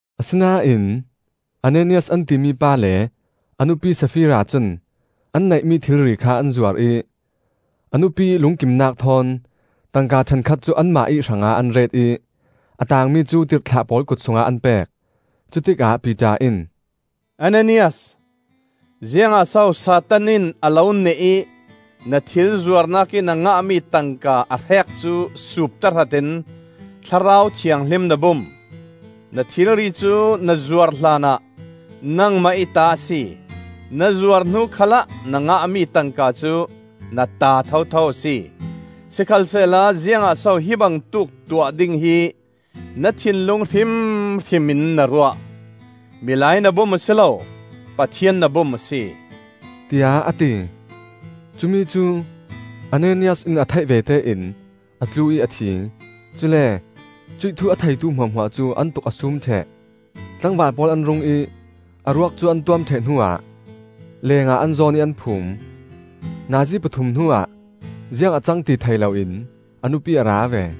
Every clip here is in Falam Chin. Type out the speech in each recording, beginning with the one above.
Asinain Ananias an timi pa le a nupi Sapfira cun an neihmi thilri kha an zuar ih, a nupi ih lungkimnak thawn tangka ṭhenkhat cu anmah ih hrangah an ret ih a taangmi cu tirhthlah pawl kut sungah an pek. Cutikah Piter in, “Ananias, ziangah so Satan in a lo neh ih na thil zuarnak ih na ngahmi tangka a hrek cu suup tahrat in Thlarau Thianghlim na bum? Na thilri cu na zuar hlanah nangmah ih ta a si; na zuar hnu khalah na ngahmi tangka cu na ta thotho a si. Sikhalsehla ziangah so hi bangtuk tuah ding hi na thinlung hrimhrim in na ruah? Milai na bum a si lo, Pathian na bum a si,” tiah a ti. Cumi cu Ananias in a theih vete in a tlu ih a thi; cule cuih thu a theitu hmuahhmuah cu an tuk a sum ṭheh. Tlangval pawl an rung ih a ruak cu an tuam ṭheh hnuah lengah an zawn ih an phum. Nazi pathum hnuah ziang a cang ti thei loin a nupi a ra ve.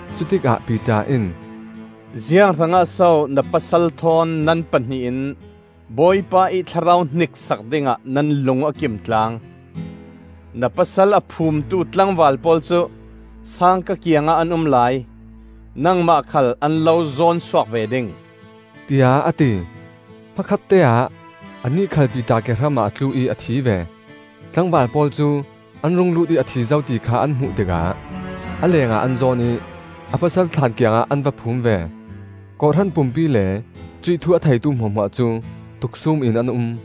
Cutikah Piter in, “Ziang hrangah so na pasal thawn nan pahnih in Bawipa ih Thlarau hniksak dingah nan lung a kimtlang? Na pasal a phumtu tlangval pawl cu sangka kiangah an um lai; nangmah khal an lo zawn suak ve ding,” tiah a ti. Hmakhatte-ah anih khal Piter kehram ah a tlu ih a thi ve. Tlangval pawl cu an rung lut ih a thi zo ti kha an hmuh tikah a lengah an zawn ih a pasal thlaan kiangah an va phum ve. Kawhhran pumpi le cuih thu a theitu hmuahhmuah cu tuksum in an um.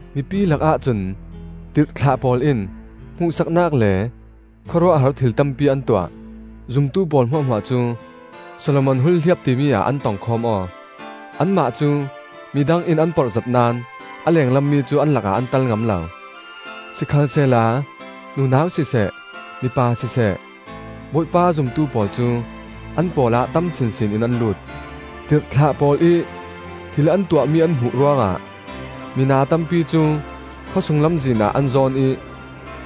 Mipi lakah cun tirhthlah pawl in hmuhsaknak le khawruahhar thil tampi an tuah. Zumtu pawl hmuahhmuah cu Solomon Hulhliap timi ah an tong khawm aw. Anmah cu midang in an porh zet naón a lenglam mi cu an lakah an tel ngam lo. Sikhalsehla nunau siseh mipa siseh Bawipa a zumtu pawl cu an pawl ah tam sinsin in an lut. Tirhthlah pawl ih thil an tuahmi an hmuh ruangah mina tampi cu khawsung lamzin ah an zawn ih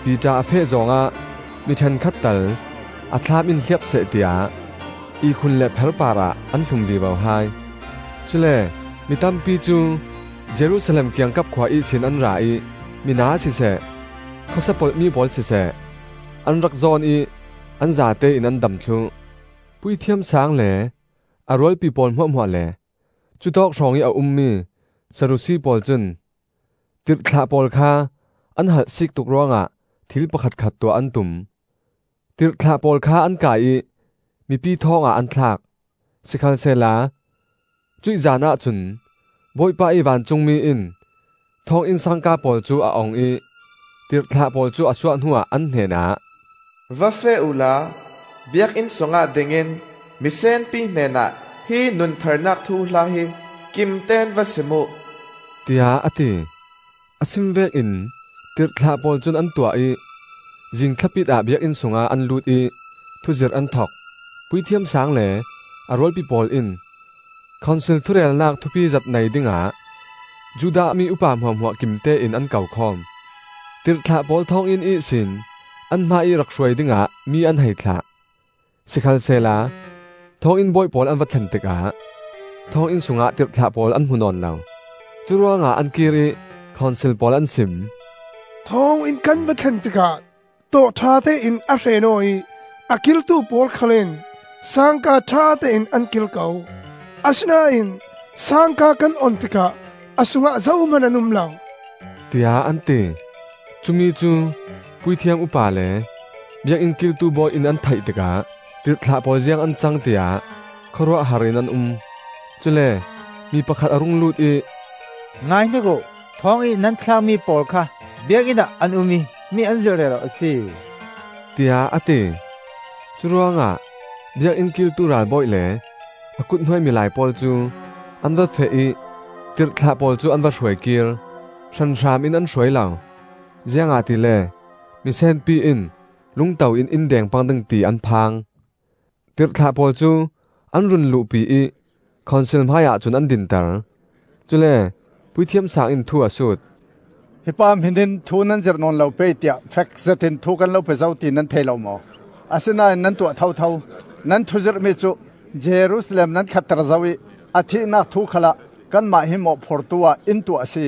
Piter a feh zawng ah mi ṭhenkhat tal a thlaam in hliap seh tiah ihkhun le pher parah an hlum vivo hai. Cule mi tampi cu Jerusalem kiangkap khua ihsin an ra ih mina siseh, khawsia polh mi pawl siseh, an rak zawn ih an zatein an dam thluh. Puithiam Saang le a rualpi pawl hmuahhmuah le cutawk hrawngih a ummi Sadusi pawl cun tirhthlah pawl kha an halhsik tuk ruangah thil pakhatkhat tuah an tum. Tirhthlah pawl kha an kai ih mipi thawng ah an thlak. Sikhalsehla cuih zanah cun Bawipa ih vancungmi in thawnginn sangka pawl cu a ong ih tirhthlah pawl cu a suah hnuah an hnenah, “Va feh uhla Biakinn sungah dingin misenpi hnenah hi nuntharnak thuhla hi kimten va sim uh,” tiah a ti. A sim vekin tirhthlah pawl cun an tuah ih zing thlapit ah Biakinn sungah an lut ih thuzirh an thok. Puithiam Saang le a rualpi pawl in Khonsil thurelnak thupi zet nei dingah Judah mi upa hmuahhmuah kimtein an ko khawm. Tirhthlah pawl thawnginn ihsin an hmaiih rak hruai dingah mi an hei thlah. Sikhalsehla thawnginn bawi pawl an va thlen tikah thawnginn sungah tirhthlah pawl an hmu nawn lo; curuangah an kir ih Khonsil pawl an sim: “Thawnginn kan va thlen tikah tawh ṭhatein a hren aw ih a kiltu pawl khal in sangka ṭhatein an kil ko; asinain sangka kan ong tikah a sungah zohman an um lo,” tiah an ti. Cumi cu puithiam upa le Biakinn kiltu bawi in an theih tikah tirhthlah pawl ziang an cang, tiah khawruahhar in an um. Cule mi pakhat a rung lut ih, “Ngaihnik uh! Thawng ih nan thlakmi pawl kha Biakinn ah an um ih mi an zirh rero a si,” tiah a ti. Curuangah Biakinn kiltu ralbawi le a kuthnuai milai pawl cu an va feh ih tirhthlah pawl cu an va hruai kir. Hranhram in an hruai lo, ziangahtile misenpi in lungto in in deng pang ding ti an phang. Tirhthlah pawl cu an run luhpi ih Khonsil hmaiah cun an dinter. Cule Puithiam Saang in thu a sut. “Hi pa hmin in thu nan zirh nawn lo pei, tiah fek zetin thu kan lo pe zo ti nan thei lo maw? Asinain nan tuah thotho. Nan thuzirhmi cu Jerusalem nan khahter zo ih a thihnak thu khalah kanmah hi mawhphurtu ah in tuah a si,”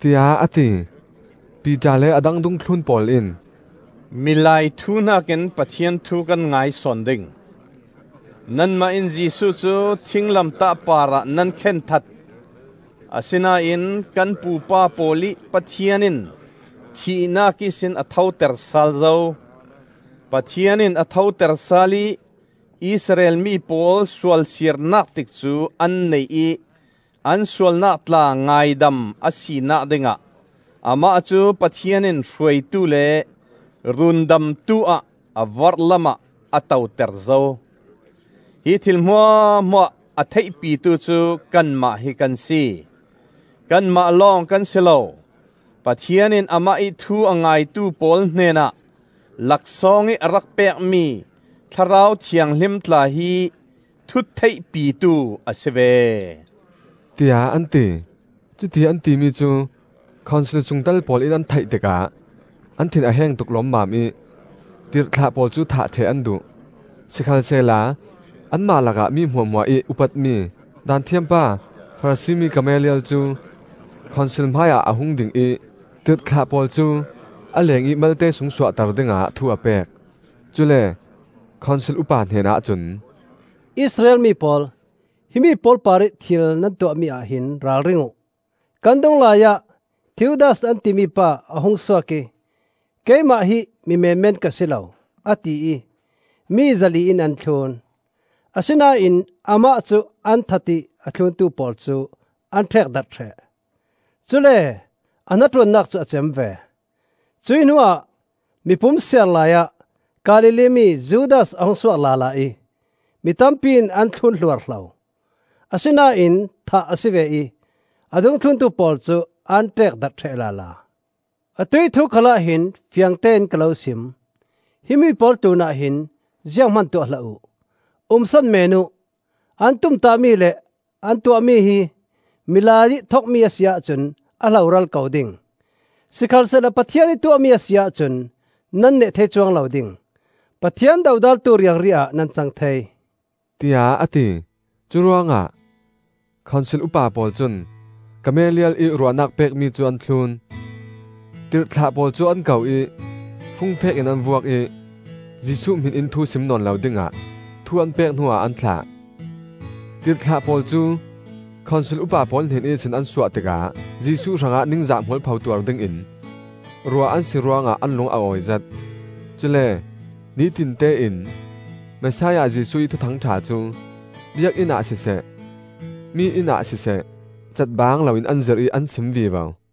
tiah a ti. Piter le a dang dungthlun pawl in, “Milai thu hnakin Pathian thu kan ngai sawn ding. Nanmah in Jesuh cu thinglamtah parah nan khen that; asinain kan pupa pawl ih Pathian in thihnak ihsin a thoter sal zo. Pathian in a thoter sal ih Israel mi pawl sualsirnak tikcu an neih ih an sualnak tla ngaidam a sinak dingah Amah cu Pathian in Hruaitu le Rundamtu ah a vorhlamah a toter zo. Hi thil hmuahhmuah a theihpitu cu kanmah hi kan si; kanmah lawng kan si lo, Pathian in amah ih thu a ngaitu pawl hnenah laksawngih a rak pekmi Thlarau Thianghlim tla hi thu theihpitu a si ve,” tiah an ti. Cutiih an timi cu Khonsil sungtel pawl in an theih tikah an thin a heng tuk lawmmam ih tirhthlah pawl cu thah ṭheh an duh. Sikhalsehla anmah lakah mi hmuahhmuah ih upatmi Daanthiam pa Farasi mi Gamaliel cu Khonsil hmaiah a hung ding ih tirhthlah pawl cu a lengih malte sung suahter dingah thu a pek. Cule Khonsil upa hnenah cun, “Israel mi pawl, himi pawl parih thil nan tuahmi ah hin ralring uh. Kan dung laiah Theudas an timi pa a hungsuak ih keimah hi mi menmen ka si lo, a ti ih mi zali in an thlun. Asinain amah cu an that ih a thluntu pawl cu an ṭekdarh ṭheh; cule a hnaṭuannak cu a cem ve. Cuih hnuah mipum siar laiah Galilee mi Judas a hungsuak lala ih mi tampi in an thlun hluarhlo; asinain thah a si ve ih a dungthluntu pawl cu an ṭekdarh ṭheh lala. Atuih thu khalah hin fiangtein ka lo sim, himi pawl tlunah hin zianghman tuah hlah uh. Umsan men uh! An tumtahmi le an tuahmi hi milai ih thokmi a si ahcun a hloral ko ding. Sikhalsehla Pathian ih tuahmi a si ahcun nan neh thei cuang lo ding. Pathian dodaltu riangri ah nan cang thei,” tiah a ti. Curuangah Khonsil upa pawl cun Gamaliel ih ruahnak pekmi cu an thlun. Tirhthlah pawl cu an ko ih fungfek in an vuak ih Jesuh hmin in thu sim nawn lo dingah thu an pek hnuah an thlah. Tirhthlah pawl cu Khonsil upa pawl hnen ihsin an suah tikah Jesuh hrangah ningzah mualpho tuar dingin ruah an si ruangah an lung a awizet. Cule nitinte in Messiah Jesuh ih Thuthang ṭha cu Biakinn ah siseh mi inn ah siseh catbang loin an zirh ih an sim vivo.